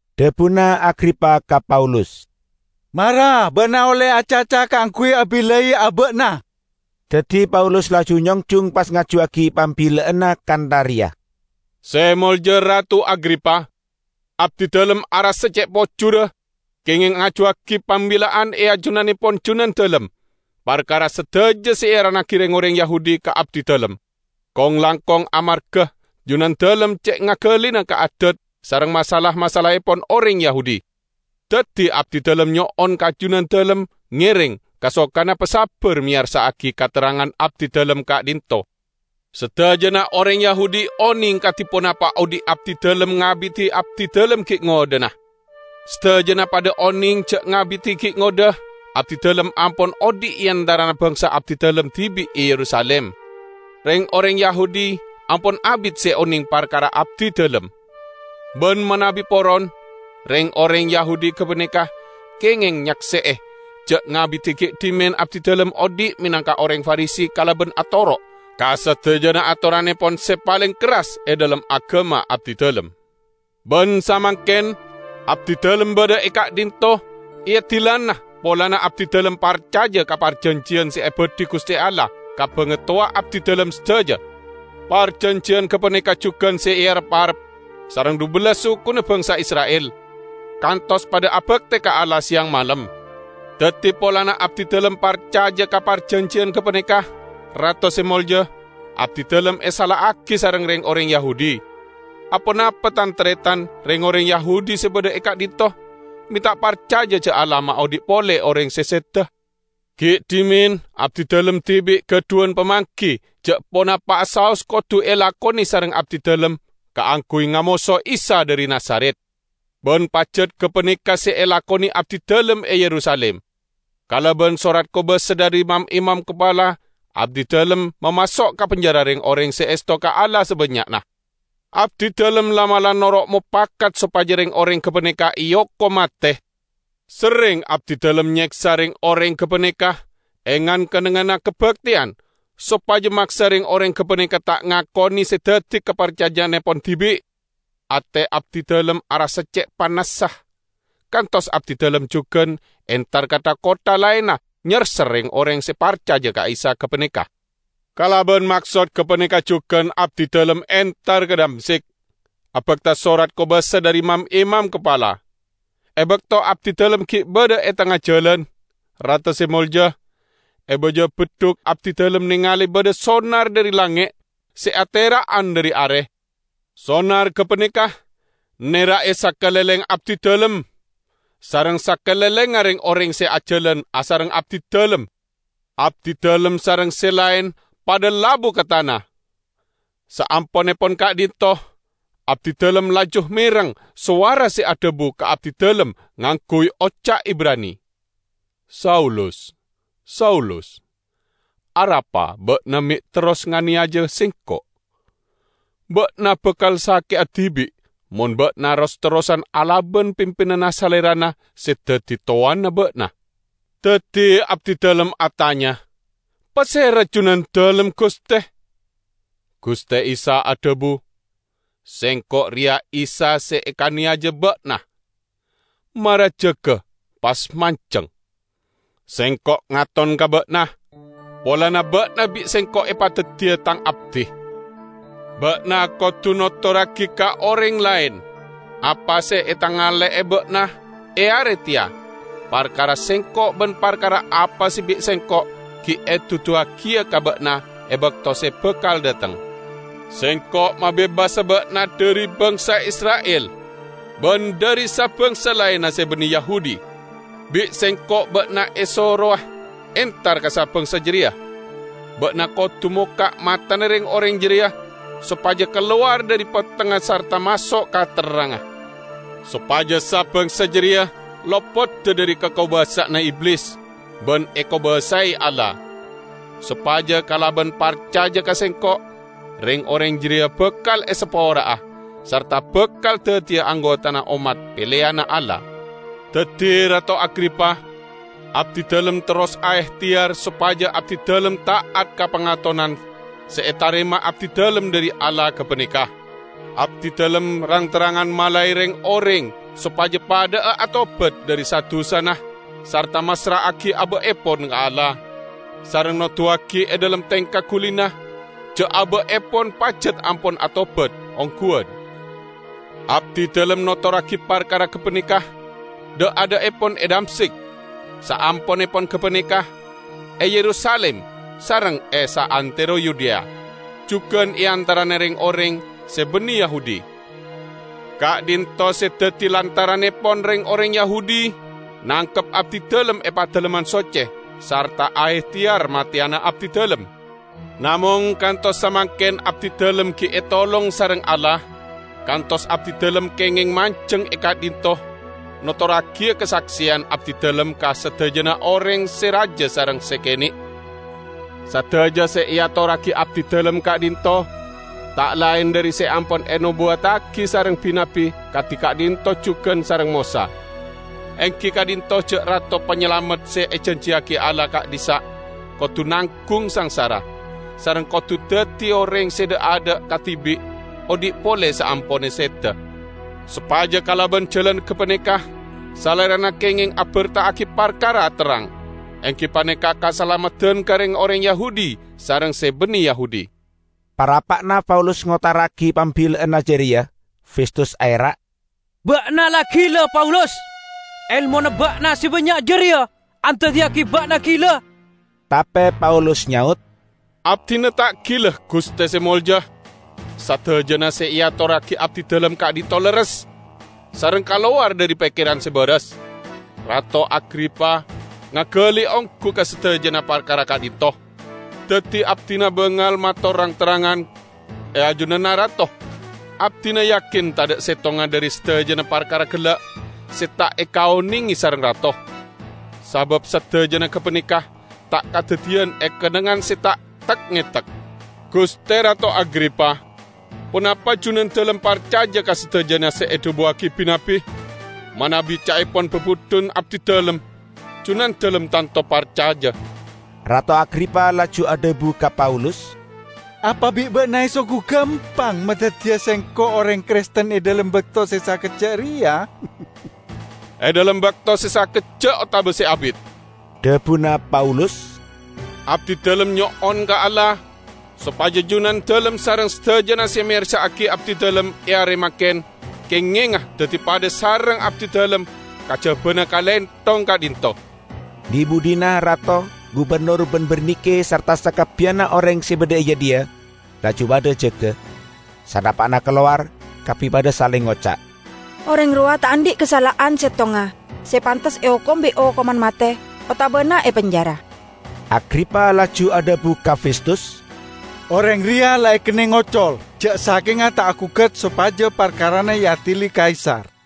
Dhabuna Agripa ka Paulus, "Mara ba'na olle acaca kaangguy abillai aba'na." Daddi Paulus laju nyongjung, pas ngajuwagi pambilla'anna kantha reya: "Se Molja Rato Agripa! Abdidalem arassa ce' pojurra kengeng ngajuwagi pambilla'an ajunannepon junandalem parkara sadaja se earannagi reng-oreng Yahudi ka abdidalem; kong-langkong amarga junandalem ce' ngagalina ka adat sareng masalah-masalahepon oreng Yahudi. Daddi abdidalem nyo'on ka junandalem ngereng kasokana pasabbar meyarsa'agi katerrangan abdidalem ka'dhinto'. Sadajana oreng Yahudi oneng kadi ponapa odhi' abdidalem ngabidi abdidalem gi' ngodhana. Sadajana padha oneng ja' ngabidi gi' ngodha abdidalem ampon odhi' e antarana bangsa abdidalem dibi' e Yerusalim. Reng-oreng Yahudi ampon abit se oneng parkara abdidalem. Ban manabi poron, reng-oreng Yahudi gapaneka kengeng nyakse'e ja' ngabidi gi' dhimen abdidalem odhi' menangka oreng Farisi kalaban atoro' ka sadajana atorannepon se paleng kerras e dhalem agama abdidalem. Ban samangken abdidalem badha e ka'dhinto' eadilana polana abdidalem parcaja ka parjanjiyan se ebadhi Guste Allah ka bangatowa abdidalem sadaja. Parjanjiyan gapaneka jugan se erep-arep sareng dhubellas sukuna bangsa Isra'il, kantos padha abakte ka Allah seyang malem. Daddi polana abdidalem parcaja ka parjanjiyan gapaneka, Rato Se Molja, abdidalem esala'agi sareng reng-oreng Yahudi. Aponapa tan-taretan reng-oreng Yahudi se badha e ka'dhinto' me' ta' parcaja ja' Allah maodhi' pole oreng se seda? Gi' dhimen abdidalem dibi' gadhuwan pamanggi ja' ponapa'a saos kodu elakone sareng abdidalem kaangguy ngamoso Isa dhari Nazaret. Ban pajat gapaneka se elakone abdidalem e Yerusalim. Kalaban sorat kobasa dhari mam-imam kapala abdidalem mamaso' ka penjara reng-oreng se esto ka Allah sabannya'na. Abdidalem la'- mala' noro' mopakat sopaja reng-oreng gapaneka eokom mate. Serreng abdidalem nyeksa reng-oreng gapaneka e ngan- kennengnganna kabakteyan, sopaja maksa reng-oreng gapaneka ta' ngakone se daddi kaparcaja'annepon dibi'. Ate abdidalem arassa ce' panassa, kantos abdidalem jugan entar ka tha-kottha laenna nyerser reng-oreng se parcaja ka Isa gapaneka." "Kalaban maksoä gapaneka jugan abdidalem entar ka Damsyik, abakta sorat kobasa dhari mam-imam kapala. E bakto abdidalem gi' badha e tengnga jalan, Rato Se Molja, e baja beddhuk abdidalem nengale badha sonar dhari langnge' se atera'an dhari are. Sonar gapaneka nera'e sakalengleng abdidalem sareng sakalenglengnga reng-oreng se ajalan asareng abdidalem. Abdidalem sareng se laen padha labu ka tana. Saamponnepon ka'dhinto' abdidalem laju mereng sowara se adhabu ka abdidalem ngangguy oca' Ibrani, 'Saulus, Saulus¡ Arapa ba'na me' terros nganeyaja Sengko'¿ Ba'na bakal sake'a dibi', mon ba'na ros- terrosan alaban pimpinanna Salerana se daddi towanna ba'na.' Daddi abdidalem atanya, 'Pasera Junandalem, Guste?' Guste Isa adhabu, 'Sengko' reya Isa se ekaneyaja ba'na. Mara jaga, pas manjeng¡ Sengko' ngaton ka ba'na polana ba'na bi' Sengko' epadaddiya Tang abdi. Ba'na kodu notorragi ka oreng laen apa se etangale'e ba'na e are teya parkara Sengko' ban parkara apa se bi' Sengko' gi' eduduwagiya ka ba'na e bakto se bakal dhateng. Sengko' mabebasa ba'na dhari bangsa Isra'il ban dhari sa- bangsa laenna se banne Yahudi. Bi' Sengko' ba'na esorowa entar ka sa-bangsa jareya; ba'na kodu mokka' matana reng-oreng jareya sopaja kalowar dhari pettengnga sarta maso' ka terrangnga, sopaja sa-bangsa jareya lopoda dhari kakobasa'anna Iblis ban ekobasae Allah, sopaja kalaban parcaja ka Sengko' reng-oreng jareya bakal esapora'a sarta bakal daddiya anggotana ommat peleyanna Allah.' " "Daddi, Rato Agripa, abdidalem terros aehteyar sopaja abdidalem ta'at ka pangatonan se etarema abdidalem dhari Allah gapaneka. Abdidalem rang-terrangan malae reng-oreng sopaja padha'a atobat dhari sa-dusana sarta massra'agi aba'epon ka Allah, sareng noduwagi e dhalem tengka gulina ja' aba'epon pajat ampon atobat ongguwan. Abdidalem notorragi parkara gapaneka dha'-adha'epon e Damsyik, saamponnepon gapaneka e Yerusalim sareng e saantero Yudea, jugan e antarana reng-oreng se banne Yahudi. Ka'dhinto' se daddi lantarannepon reng-oreng Yahudi nangkep abdidalem e Padalemman Socce sareng aehteyar mateyana abdidalem. Namong kantos samangken abdidalem gi' etolong sareng Allah, kantos abdidalem kengeng manjeng e ka'dhinto' notorragiya kasakseyan abdidalem ka sadajana oreng se raja sareng se kene'. Sadaja se eatorragi abdidalem ka'dhinto' ta' laen dhari se ampon enobuwattagi sareng bi-nabbi, kadi ka'dhinto' jugan sareng Mosa; enggi ka'dhinto' ja' Rato Panyalamet se ejanjiyagi Allah ka'dhissa' kodu nanggung sangsara, sareng kodu daddi oreng se dha'-adha' kadibi' odhi' pole saamponna seda» sopaja kalaban jalan gapaneka Salerana kengeng aberta'agi parkara terrang enggi paneka kasalameddan ka reng-oreng Yahudi sareng se banne Yahudi." Parappa'na Paulus ngotara'agi pambilla'anna jareya, Festus aera', "Ba'na la gila, Paulus! Elmona ba'na se bannya' jareya andaddiyagi ba'na gila!" Tape Paulus nyaot, "Abdina ta' gila, Guste Se Molja! Sadajana se eatorragi abdidalem ka'dhinto' lerres, sareng kalowar dhari pekkeran se baras. Rato Agripa ngagali onggu ka sadajana parkara ka'dhinto'. Daddi abdina bangal mator rang-terrangan e ajunanna Rato. Abdina yakin tadha' settonga dhari sadajana parkara gella' se ta' ekaonenge sareng Rato, sabab sadajana gapaneka ta' kadaddiyan e kennengngan se ta' tek-ngetek. Guste Rato Agripa, ponapa junandalem parcaja ka sadajana se edhabuwagi bi-nabbi? Manabi ca'epon babudhun abdidalem, junandalem tanto parcaja!" Rato Agripa laju adhabu ka Paulus, "Apa bi' ba'na esanggu gampang madaddiya sengko' oreng Kristen e dhalem bakto se sakejja' reya?" "E dhalem bakto se sakejja' otaba se abit," ca'na dhabuna Paulus, "abdidalem nyo'on ka Allah sopaja junandalem sareng sadajana se meyarsa'agi abdidalem e are mangken kengenga daddi padha sareng abdidalem -- kajabana kalenthong ka'dhinto'!" Dhi-budhina rato, gubennor ban Bernike sarta sakabbiyanna oreng se badha e jadhiya laju padha jaga. Sanapa'na kalowar, kabbi padha saleng ngoca', "Oreng rowa ta' andhi' kasala'an settonga se pantes eokom bi' okoman mate, otabana epenjara." Agripa laju adhabu ka Festus, "Oreng reya la ekenneng ocol, ja' sakenga ta' agugat sopaja parkarana eadili Kaisar."